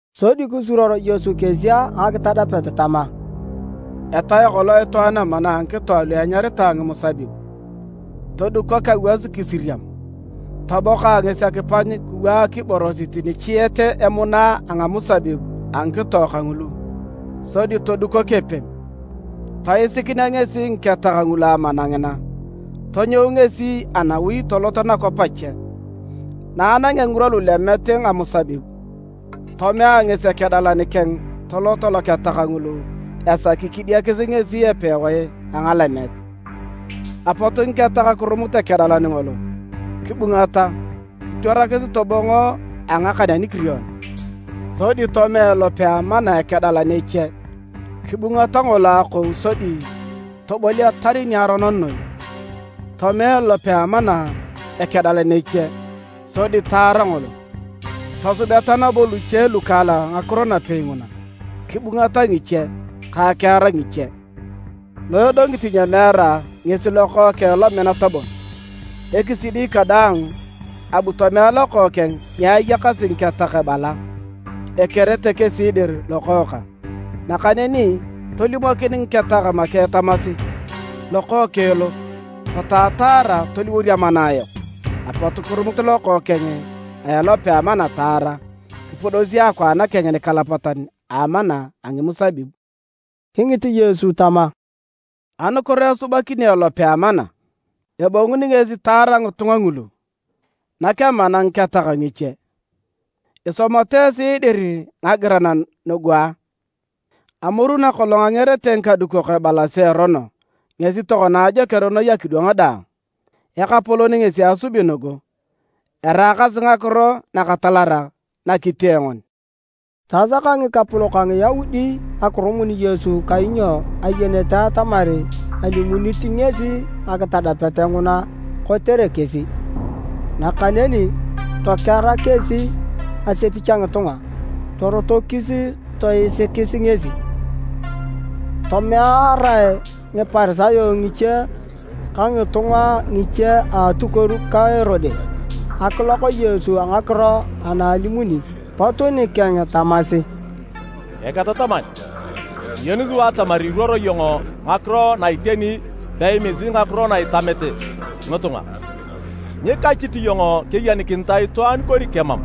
Sodi kisuruor Yesu kesi a ngakitadapet tama: “Etae kolong itwaan amana a ngikito alu enyaritae ngimusabib, todukok awas kisiriam. Toboka ngesi akipany kiwaak iborosit nichiet emuna a ngamusabib a ngikito kangulu, sodi todukok epem. Toesikinea ngesi ngiketak ngulu amana ngina, tonyou ngesi anawi tolot nakwap ache. Na anangea ngirwa lulemet ngamusabib, tomea ngesi ekedalan keng tolot loketak ngulu esaki kidiakis ngesi epewae a ngalemet. Apot ngiketak kirumut ekedalan ngolo, kibungata, kitwarakis tobongo a ngakan anikirion. Sodi tomea elope a amana ekedalan eche. Kibungata ngolo akou sodi toboliatar niaronon noi. Tomea elope a amana ekedalan eche, sodi taara ngolo. Tosubeta nabo luche lukaalak ngakiro napei nguna, kibungata ngiche ka akiar ngiche. Lo edongit nyemeara ngesi lokookeng lominat bon. Ekisidi kadaang, abu tomea lokookeng ni ayakasi ngiketak ebala, ‘Ekerete kesi dir lokookang.’ Nakaneni tolimokin ngiketak make tamasi, ‘Lokookeng lo, potu ataara toliworor amana ayok!’ Apot kirumut lokookeng a elope a amana taara, kipudosi akwaan keng nikalapatan a amana a ngimusabib.” Kingit Yesu tama, “Anukiro esubakini elope a amana? Ebonguni ngesi taar ngitunga ngulu, nak amana ngiketak ngiche. Isomata esi dir ngagiran nugu a? ‘Amoru nakolong angerete ngikadukok ebalasi erono ngesi tokona ajoker noi edwang daang. Ekapolon ngesi asubi nugu. Eraakasi ngakiro nakatalarak na kitee ngoni!’” Tasaka ngikapolok a Ngiyaudi akirumun Yesu kainyo ayenete atamar alimunit ngesi ngakitadapet nguna kotere kesi. Nakaneni tokera kesi asepich a ngitunga, torotokis toisikis ngesi. Tomearae Ngiparisayo ngiche ka ngitunga ngiche a atukuor ka Erode akilok Yesu a ngakiro ana elimuni. Pot nikeng tamasi, “Eketataman, kiyeni sua atamar iruoro iyong ngakiro na a iteni peimisit ngakiro na itamete ngitunga. Nyikachit iyong keyenikinitae itwaan kori kemam,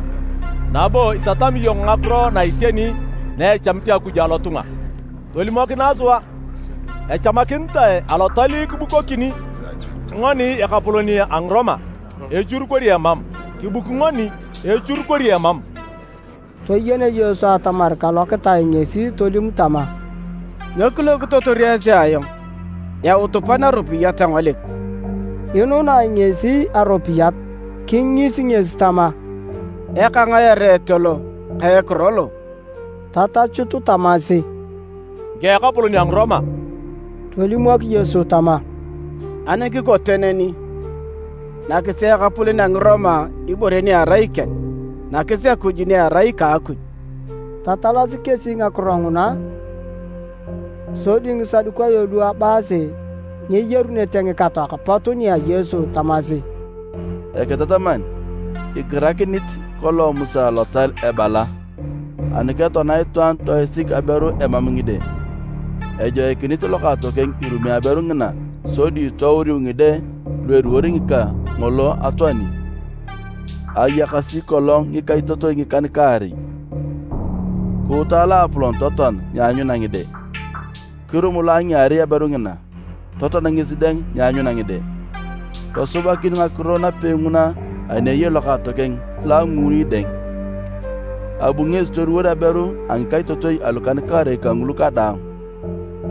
nabo itatami iyong ngakiro na iteni na echamit Akuj alotunga. Tolimokinae sua, echamakinitae alotal kibukokini ngoni ekapolon a Ngiroma echur kori emam? Kibuki ngoni echur kori emam?” Toyen Yesu atamar kalokitae ngesi tolim tama, “Nyo kilokitotor esi ayong? Yautu pan aropiyat engolik.” Inunae ngesi aropiyat. Kingis ngesi tama, “Eka ngae ereet lo ka ekiro lo?” Tatachut tamasi, “Ngika a ekapolon a Ngiroma.” Tolimok Yesu tama, “Ani kikote neni, nakisi ekapolon a Ngiroma ibore ni erai ikeng, nakis Akuj ni erai ika Akuj.” Tatalasi kesi ngakiro nguna. Sodi Ngisadukayo lu ebaasi nyeyarunete ngikatoak pot nia Yesu tamasi, “Eketataman, igirakinit kolong Musa lotal ebala: ‘Ani ketoana itwaan toisik aberu emam ngide, ejoikinit lokaatokeng irumi aberu ngina sodi touriu ngide lu eliwor ngika ngolo atoani.’ Ayakasi kolong ngikaitotoi ngikan-kaarei, kuuta loapolon totoan nyeanyuna ngide. Kirum lo a ngiarei aberu ngina, totoan ngesi dang nyeanyuna ngide. Tosubakin ngakiro napei nguna ani eyei lokaatokeng lo a nguuni dang, abu ngesi toliwor aberu a ngikaitotoi alukan-kaarei kangulu kadaang,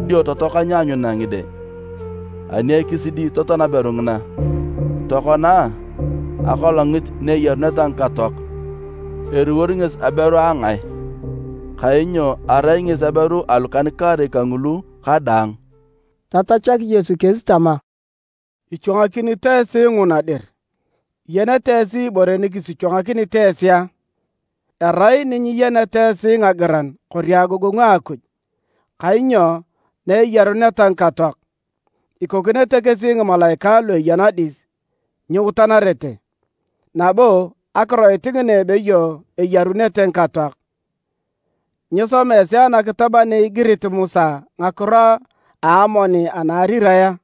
dio totoaka nyeanyuna ngide. Ani ekisidi totoan aberu ngina. Tokona a, akolongit na eyaruneta ngikatoak, eliwor ngesi aberu a ngae? Kainyo arai ngesi aberu alukan-kaarei kangulu kadaang.” Tatachak Yesu kesi tama, “Ichwangakinito esi nguna dir! Iyenete esi ibore nikisichwangakinit esi a? Erai ni nyiyeneta esi ngagiran kori agogongu a Akuj. Kainyo na eyaruneta ngikatoak. Ikokinete kesi ngimalaikae lu eya nadis, nyiutanarete. Nabo akiroit ngina ebeyo eyarunete ngikatoak, nyisoma esi anakitab ana igirit Musa ngakiro a amoni anaarirae a?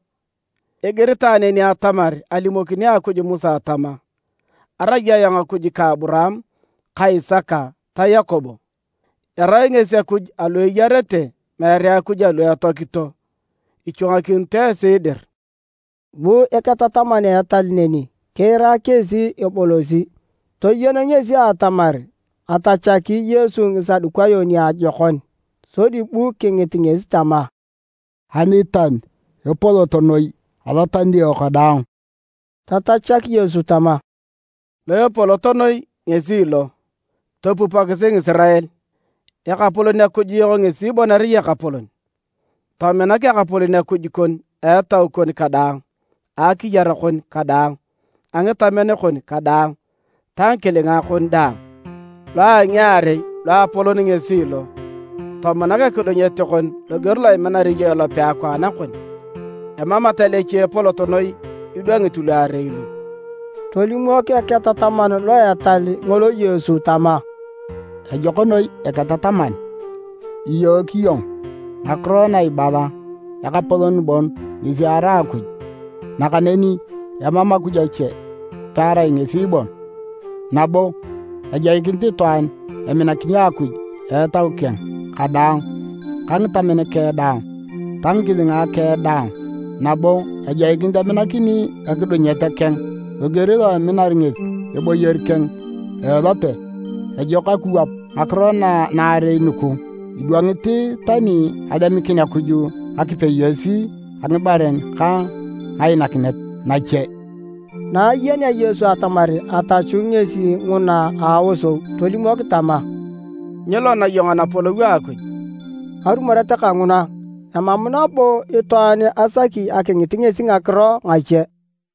Igiritae neni atamar alimokini Akuj Musa tama, ‘Arai ayong Akuj ka Aburaam ka Isaka ta Yakobo.’ Erai ngesi Akuj alu eyarete meere Akuj alu etoakito. Ichwangakinito esi dir!” Bu eketataman a etal neni kiira kesi ebolosi. Toyen ngesi atamar atachaki Yesu Ngisadukayo niajokon, sodi bu kingit ngesi tama, “Alital epolot noi alotalio kadaang?” Tatachak Yesu tama, “Lo epolot noi ngesi lo: ‘Topupokisi Ngisirael! Ekapolon Akuj yok ngesi bon erai Ekapolon. Tominak Ekapolon Akuj kon a etau kon kadaang, a akiyar kon kadaang, a ngitamen kon kadaang ta ngikilinga kon daang.’ Lo a ngiarei loapolon ngesi lo: ‘Tominak ekidunyet kon loger lo iminar iyong ilope akwaan kon.’ Emam etal eche epolot noi idwangit luarei lu.” Tolimok eketataman lo etal ngolo Yesu tama, “Ejok noi Eketataman! Iyook iyong ngakiro na ibala Ekapolon bon ngesi erai Akuj, nakaneni emam Akuj ache pearai ngesi bon. Nabo ejoikinit itwaan eminakini Akuj a Etau keng kadaang ka ngitamen keng daang ta ngikilinga keng daang, nabo ejoikinit eminakini ekidunyet keng loger lo eminar ngesi eboyor keng a ilope. Ejok akiwap ngakiro naarei nugu idwangit tani alemikin Akuj ngakipeyos a ngibaren ka ngainakinet nache.” Na ayenea Yesu atamar atachu ngesi nguna a aosou, tolimok tama, “Nyilona iyong Anapolou a Akuj.” Arumoret kanguna, emam nabo itwaan asak akingit ngesi ngakiro ngache.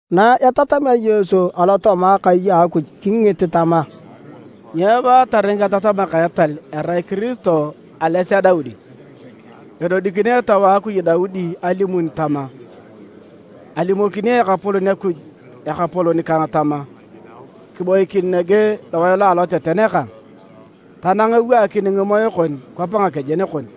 Na etatamea Yesu alotooma akai a Akuj kingit tama, “Nyo ebaatar ngiketatamak a etal erai Kiristo ales a Daudi? Edodikini Etau a Akuj Daudi alimun tama: ‘Alimokini Ekapolon Akuj Ekapolon kang tama, kiboikin nege lowae lo aloteten kang, tanang eewaakini ngimoe kon kwap ngakejen kon!’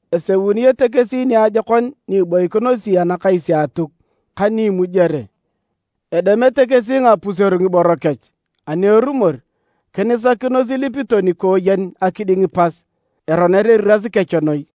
Eseunete kesi niajokon ni iboikinosi anakais a Atuk ka ni imujere. Edemete kesi ngapuseru ngiboro kech, ani erumor, kinisakinos ilipito nikooyen akiding pas. Eroner eriras kech noi!”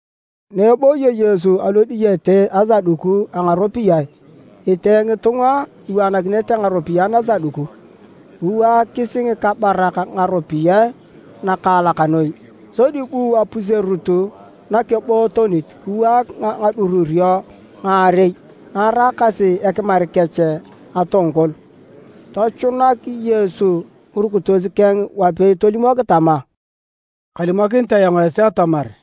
Na ebooyo Yesu alodiyete asaduku a ngaropiyae, etee ngitunga iwaanakinete ngaropiyae nasaduku. Kiwaakis ngikabarak ngaropiyae nakaalak noi. Sodi bu apuserut nakebootonit kiwaak ngadururio ngaarei na eraakasi ekimar kech atongkol. Tochunak Yesu ngirukitos keng wapei tolimok tama, “Kalimokinit ayong esi atamar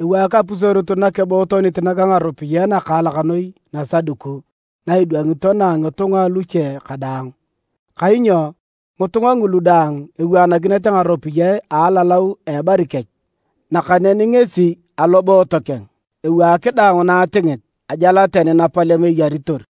ewaak apuserut nakebootonit naga ngaropiyae nakaalak noi nasaduku na idwangito na a ngitunga aluche kadaang. Kainyo ngitunga ngulu daang ewaanakinete ngaropiyae analalau a ebari kech. Nakaneni ngesi, aloboot keng, ewaak daang na atingit, ajal tani napalem eyaritor.”